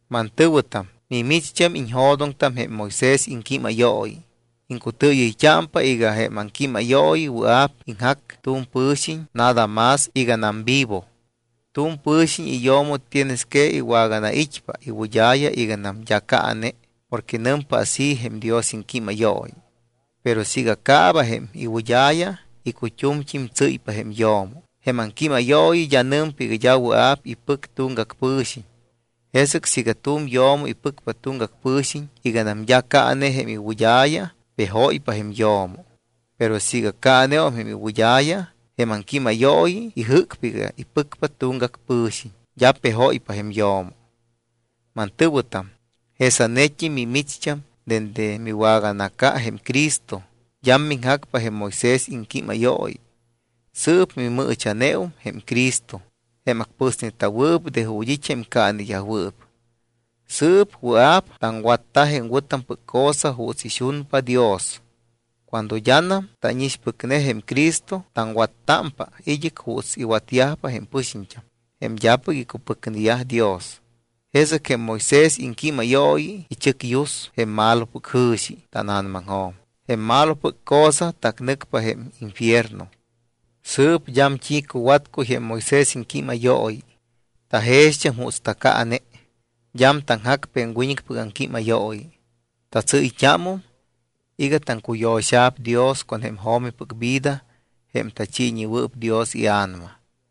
Mantɨ̱wɨtam, mimicht́am iñjo̱doŋtam jém Moisés iŋquímayooyi. Iŋcutɨɨyɨyt́ámpa iga jém aŋquímayooyi wɨa̱p iŋjac tu̱m pɨ̱xiñ nada más iganam vivo. Tu̱m pɨ̱xiñ iyo̱mo tienes que iwaganait́pa iwɨd́a̱ya iganam d́a caane porque nɨmpa así jém Dios iŋquímayooyi. Pero siiga caaba jém iwɨd́a̱ya, icut́umt́im tsɨ́ypa jém yo̱mo, jém aŋquímayooyi d́a nɨmpa iga d́a wɨa̱p ipɨc tuŋgac pɨ̱xiñ. Jesɨc siiga tu̱m yo̱mo ipɨcpa tuŋgac pɨ̱xiñ iganam d́a caane jém iwɨd́a̱ya, pejóypa jém yo̱mo. Pero siiga caaneum jém iwɨd́a̱ya, jém aŋquímayooyi ijɨ́cpa iga ipɨcpa tuŋgac pɨ̱xiñ, d́a pejóypa jém yo̱mo. Mantɨ̱wɨtam, jesanet́im mimicht́am dende miwaganaca jém Cristo, d́am miŋjacpa jém Moisés iŋquímayooyi. Sɨɨp mimɨɨcha̱neum jém Cristo, jém acpɨsneta̱wɨɨp de ju̱t́ it́ jém caaneyajwɨɨp. Sɨɨp wɨa̱p taŋwatta jém wɨ̱tampɨc cosa juuts ixunpa Dios. Cuando d́anam tánixpɨcne jém Cristo, taŋwattámpa id́ɨc juuts iwatyajpa jém pɨxiñt́am, jém d́apɨc icupɨcneyaj Dios. Jesɨc jém Moisés iŋquímayooyi ichɨcyus jém malopɨc jɨ̱xi tána̱namaŋjo̱m. Jém malopɨc cosa tacnɨcpa jém infierno. Sɨɨp d́am t́i cuwatcuy jém Moisés iŋquímayooyi. Tajext́am juuts tacaane. D́am taŋjacpa jém wiñɨcpɨc aŋquímayooyi. Tatsɨ́yt́ámum iga taŋcuyo̱xa̱p Dios con jém jo̱mipɨc vida jém tachiiñewɨɨp Dios iA̱nama.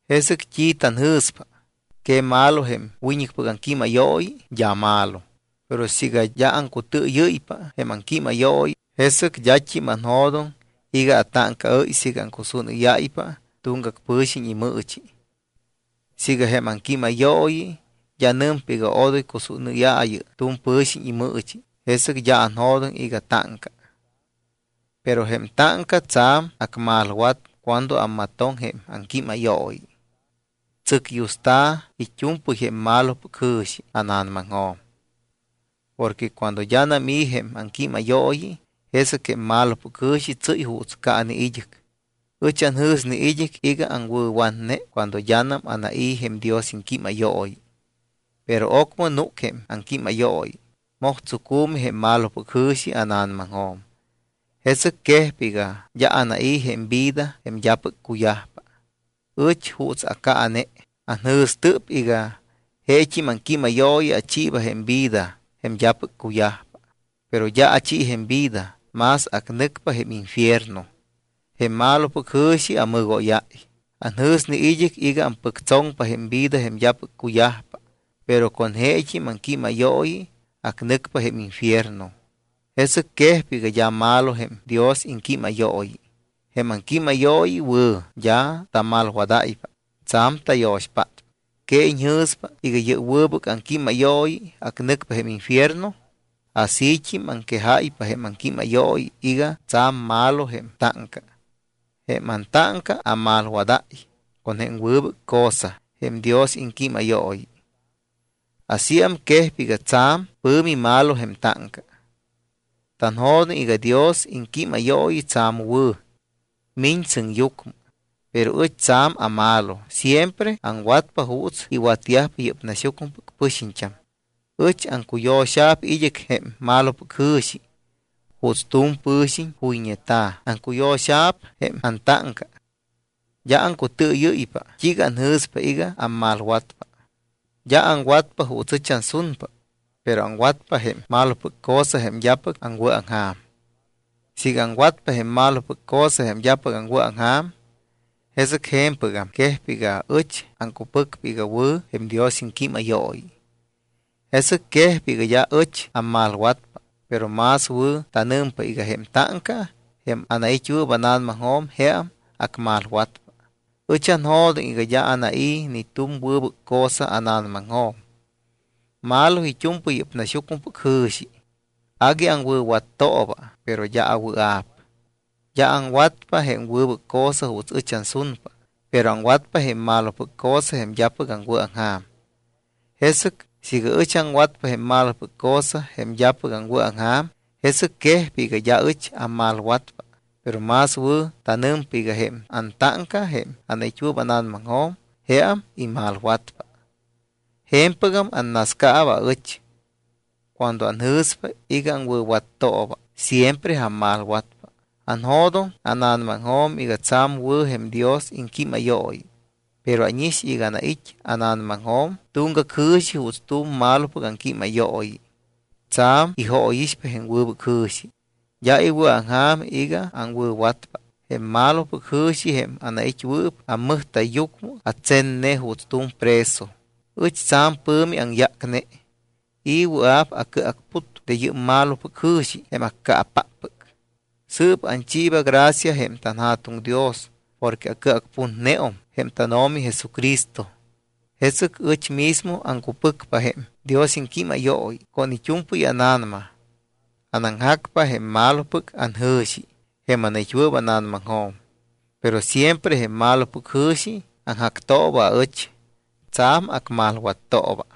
¿Jesɨc t́i tanjɨ̱spa? ¿Que malo jém wiñɨcpɨc aŋquímayooyi? D́a malo. Pero siiga d́a aŋcutɨɨyɨ́ypa jém aŋquímayooyi, jesɨc d́at́im anjo̱doŋ iga atáŋcaɨ́y siiga aŋcusúnɨ́yáypa tuŋgac pɨ̱xiñ imɨɨchi. Siiga jém aŋquímayooyi d́a nɨmpa iga odoy cusúnɨ́yaayɨ tu̱m pɨ̱xiñ imɨɨchi, jesɨc d́a anjo̱doŋ iga táŋca. Pero jém táŋca tsa̱m acmalwat cuando ammatoŋ jém aŋquímayooyi. Tsɨcyusta̱ it́u̱mpɨy jém malopɨc jɨ̱xi ána̱namaŋjo̱m. Porque cuando d́anam i̱ jém aŋquímayooyi, jesɨc jém malopɨc jɨ̱xi tsɨ́y juuts caane id́ɨc. Ɨch anjɨ̱sne id́ɨc iga aŋwɨ̱watne cuando d́anam anai̱ jém Dios iŋquímayooyi. Pero ocmɨ núc jém aŋquímayooyi, moj tsucu̱mi jém malopɨc jɨ̱xi ána̱namaŋjo̱m. Jesɨc quejpa iga d́a anai̱ jém vida jém d́apɨc cuyajpa. Ɨch juuts acaane. Anjɨ̱stɨp iga jeet́im aŋquímayooyi achiiba jém vida jém d́apɨc cuyajpa. Pero d́a achi jém vida, más acnɨcpa jém infierno. Jém malopɨc jɨ̱xi amɨgóyáy. Anjɨ̱sne id́ɨc iga ampɨctsoŋpa jém vida jém d́apɨc cuyajpa. Pero con jeet́im aŋquímayooyi acnɨcpa jém infierno. Jesɨc quejpa iga d́a malo jém Dios iŋquímayooyi. Jém aŋquímayooyi wɨ̱, d́a tamalwadáypa. Tsa̱m tayo̱xpátpa. ¿Que iñjɨ̱spa iga yɨ́p wɨbɨc aŋquímayooyi acnɨcpa jém infierno? Asít́im aŋquejáypa jém aŋquímayooyi iga tsa̱m malo jém táŋca. Jém antáŋca amalwadáy con jém wɨbɨc cosa jém Dios iŋquímayooyi. Asíam quejpa iga tsa̱m pɨ̱mi malo jém táŋca. Tanjo̱doŋ iga Dios iŋquímayooyi tsa̱m wɨ̱, miñ sɨŋyucmɨ. Pero ɨch tsa̱m amalo, siempre aŋwatpa juuts iwatyajpa yɨ́p naxyucmɨpɨc pɨxiñt́am. Ɨch aŋcuyo̱xa̱p id́ɨc jém malopɨc jɨ̱xi. Juuts tu̱m pɨ̱xiñ juyñeta̱, aŋcuyo̱xa̱p jém antáŋca. D́a aŋcutɨɨyɨ́ypa t́iiga anjɨ̱spa iga ammalwatpa. D́a aŋwatpa juuts ɨch ansunpa, pero aŋwatpa jém malopɨc cosa jém d́apɨc aŋwɨ̱aŋja̱m. Siiga aŋwatpa jém malopɨc cosa jém d́apɨc aŋwɨ̱aŋja̱m, jesɨc je̱mpɨgam quejpa iga ɨch aŋcupɨcpa iga wɨ̱ jém Dios iŋquímayooyi. Jesɨc quejpa iga d́a ɨch ammalwatpa, pero más wɨ̱ tanɨmpa iga jém táŋca, jém anait́wɨɨp ána̱namaŋjo̱m, jeam acmalwatpa. Ɨch anjo̱doŋ iga d́a anai̱ ni tu̱m wɨbɨc cosa ána̱namaŋjo̱m. Malo it́u̱mpɨy yɨ́p naxyucmɨpɨc jɨ̱xi. Agui aŋwɨ̱wattooba, pero d́a awɨa̱p. D́a aŋwatpa jém wɨbɨc cosa juuts ɨch ansunpa, pero aŋwatpa jém malopɨc cosa jém d́apɨc aŋwɨ̱aŋja̱m. Jesɨc siiga ɨch aŋwatpa jém malopɨc cosa, jém d́apɨc aŋwɨ̱aŋja̱m, jesɨc quejpa iga d́a ɨch ammalwatpa. Pero más wɨ̱ tanɨmpa iga jém antáŋca, jém anait́wɨɨp ána̱namaŋjo̱m, jeam imalwatpa. Je̱mpɨgam annascaaba aɨch. Cuando anjɨ̱spa iga aŋwɨ̱wattooba, siempre ammalwatpa. Anjo̱doŋ ána̱namaŋjo̱m iga tsa̱m wɨ̱ jém Dios iŋquímayooyi. Pero ánix iga anait́ ána̱namaŋjo̱m tuŋgac jɨ̱xi juuts tu̱m malopɨc aŋquímayooyi. Tsa̱m ijóyixpa jém wɨbɨc jɨ̱xi. D́a iwɨ̱aŋja̱m iga aŋwɨ̱watpa. Jém malopɨc jɨ̱xi, jém anait́wɨɨp ammɨjta̱yyucmɨ, atsenne juuts tu̱m preso. Ɨch tsa̱m pɨ̱mi aŋyácne. ¿I̱ wɨa̱p acɨacput de yɨ́p malopɨc jɨ̱xi, jém accaapáppɨc? Sɨɨp anchiiba gracia jém tanJa̱tuŋ Dios porque acɨacputneum jém tánO̱mi Jesucristo. Jesɨc ɨch mismo aŋcupɨcpa jém Dios iŋquímayooyi con it́u̱mpɨy ána̱nama. Anaŋjacpa jém malopɨc anjɨ̱xi jém anait́wɨɨp ána̱namaŋjo̱m. Pero siempre jém malopɨc jɨ̱xi aŋjactooba aɨch, tsa̱m acmalwattooba.